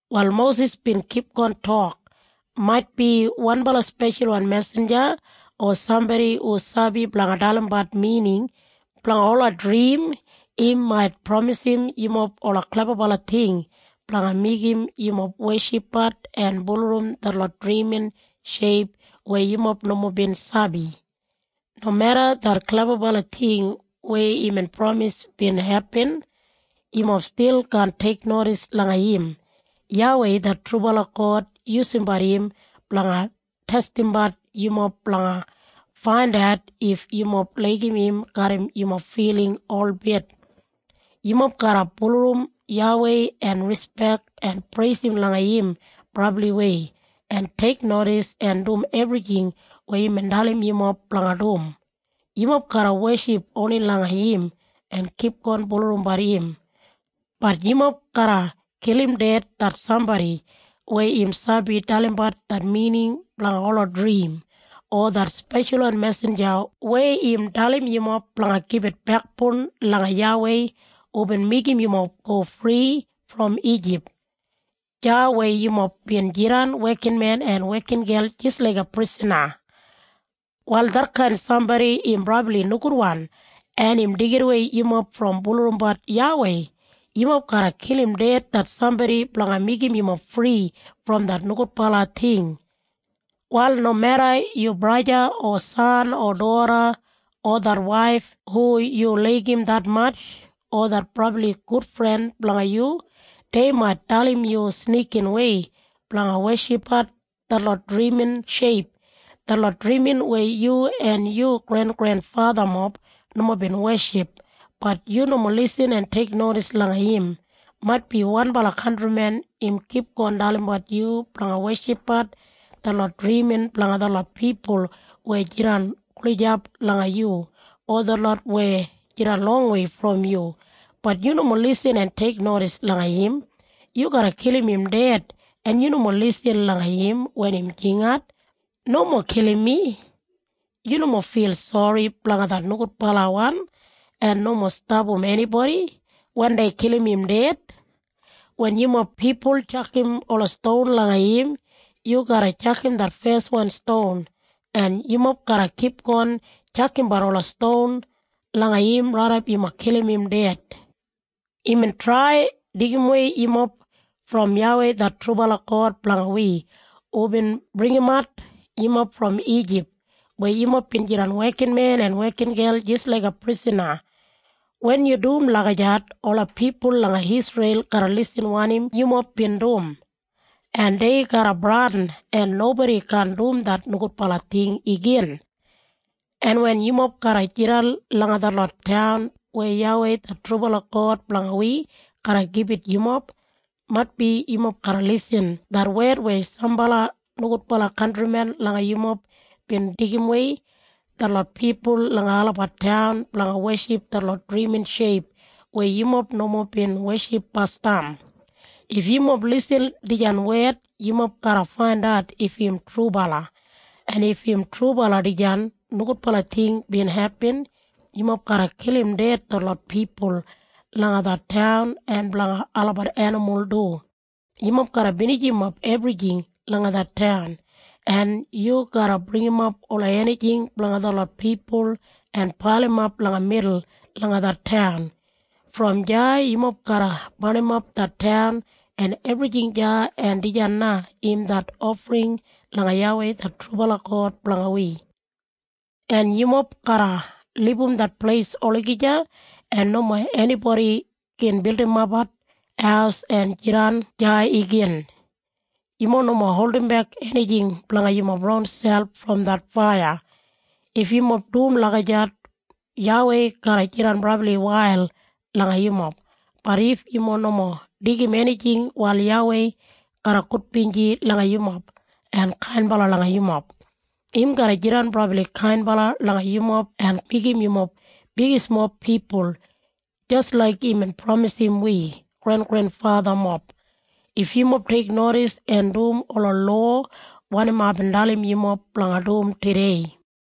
Wal Mosis bin kipgon tok, “Maitbi wanbala speshalwan mesinja o sambodi hu sabi blanga dalimbat mining blanga ola drim im mait pramisim yumob ola klebabala ting blanga meigim yumob weshipbat en bulurrum detlot drimin sheip weya yumob nomo bin sabi. Nomeda det klebabala ting weya imbin pramis bin hepin, yumob stil kaan teiknodis langa im. YAWEI det trubala God yusumbat im blanga testimbat yumob blanga faindat if yumob laigim im garram yumob filing holbit. Yumob garra bulurrum YAWEI en rispek en preisim langa im brabliwei, en teiknodis en dum ebrijing weya imbin dalim yumob blanga dum. Yumob garra weship oni langa im en kipgon bulurrumbat im. Bat yumob garra kilim ded det sambodi weya im sabi dalimbat det mining blanga ola drim o det speshalwan mesinja weya im dalim yumob blanga gibit bekboun langa YAWEI hubin meigim yumob go fri brom Ijip, deya weya yumob bin jidan wekinmen en wekingel jis laiga prisana. Wal detkain sambodi im brabli nogudwan en im deigimwei yumob brom bulurrumbat YAWEI. Yumob garra kilim ded det sambodi blanga meigim yumob fri brom det nogudbala ting. “Wal nomeda yu braja o san o doda o det waif hu yu laigim detmatj, o det brabli gudfren blanga yu, dei mait dalim yu snikinwei blanga weshipbat detlot drimin sheip, detlot drimin weya yu en yu grengrenfathamob nomo bin weship, bat yu nomo lisin en teiknodis langa im. Maitbi wanbala kantrimen im kipgon dalimbat yu blanga weshipbat detlot drimin blanga detlot pipul weya jidan gulijap langa yu, o detlot weya jidan longwei brom yu. Bat yu nomo lisin en teiknodis langa im. Yu garra kilim im ded en yu nomo lisin langa im wen im jingat, ‘Nomo kilim mi.’ Yu nomo fil sori blanga det nogudbalawan en nomo stapam enibodi wen dei kilim im ded. Wen yumob pipul tjakam ola ston langa im, yu garra tjakam det feswan ston, en yumob garra kipgon tjakambat ola ston langa im raidap yumob kilim im ded. Imbin trai deigimwei yumob brom YAWEI det trubala God blanga wi hubin bringimat yumob brom Ijip weya yumob bin jidan wekinmen en wekingel jis laiga prisana. Wen yu dum lagijat ola pipul langa Isreil garra lisin wanim yumob bin dum, en dei garra bradin en nobodi kaan dum det nogudbala ting igin. “En wen yumob garra jidan langa detlot taun weya YAWEI det trubala God blanga wi garra gibit yumob, maitbi yumob garra lisin det wed weya sambala nogudbala kantrimen langa yumob bin deigimwei detlot pipul langa olabat taun blanga weship detlot drimin sheip weya yumob nomo bin weship basdam. If yumob lisin dijan wed yumob garra faindat if im trubala. En if im trubala dijan nogudbala ting bin hepin, yumob garra kilim ded detlot pipul langa det taun en blanga olabat enimul du. Yumob garra binijimap ebrijing langa det taun. En yu garra bringimap ola enijing blanga detlot pipul en pailimap langa midul langa det taun. Brom deya yumob garra barnimap det taun en ebrijing deya en dijan na im det ofring langa YAWEI det trubala God blanga wi. En yumob garra libum det pleis olagija en nomo enibodi gin bildimapbat haus en jidan deya igin. Yumob nomo holdimbek enijing blanga yumob ronselp brom det faiya. If yumob dum lagijat YAWEI garra jidan brabli wail langa yumob. Bat if yumob nomo deigim enijing wal YAWEI garra gudbinji langa yumob en kainbala langa yumob. Im garra jidan brabli kainbala langa yumob en meigim yumob bigismob pipul, jis laik imbin pramisim wi grengrenfathamob, if yumob teiknodis en dum ola lowa wanim aibin dalim yumob blanga dum tudei.”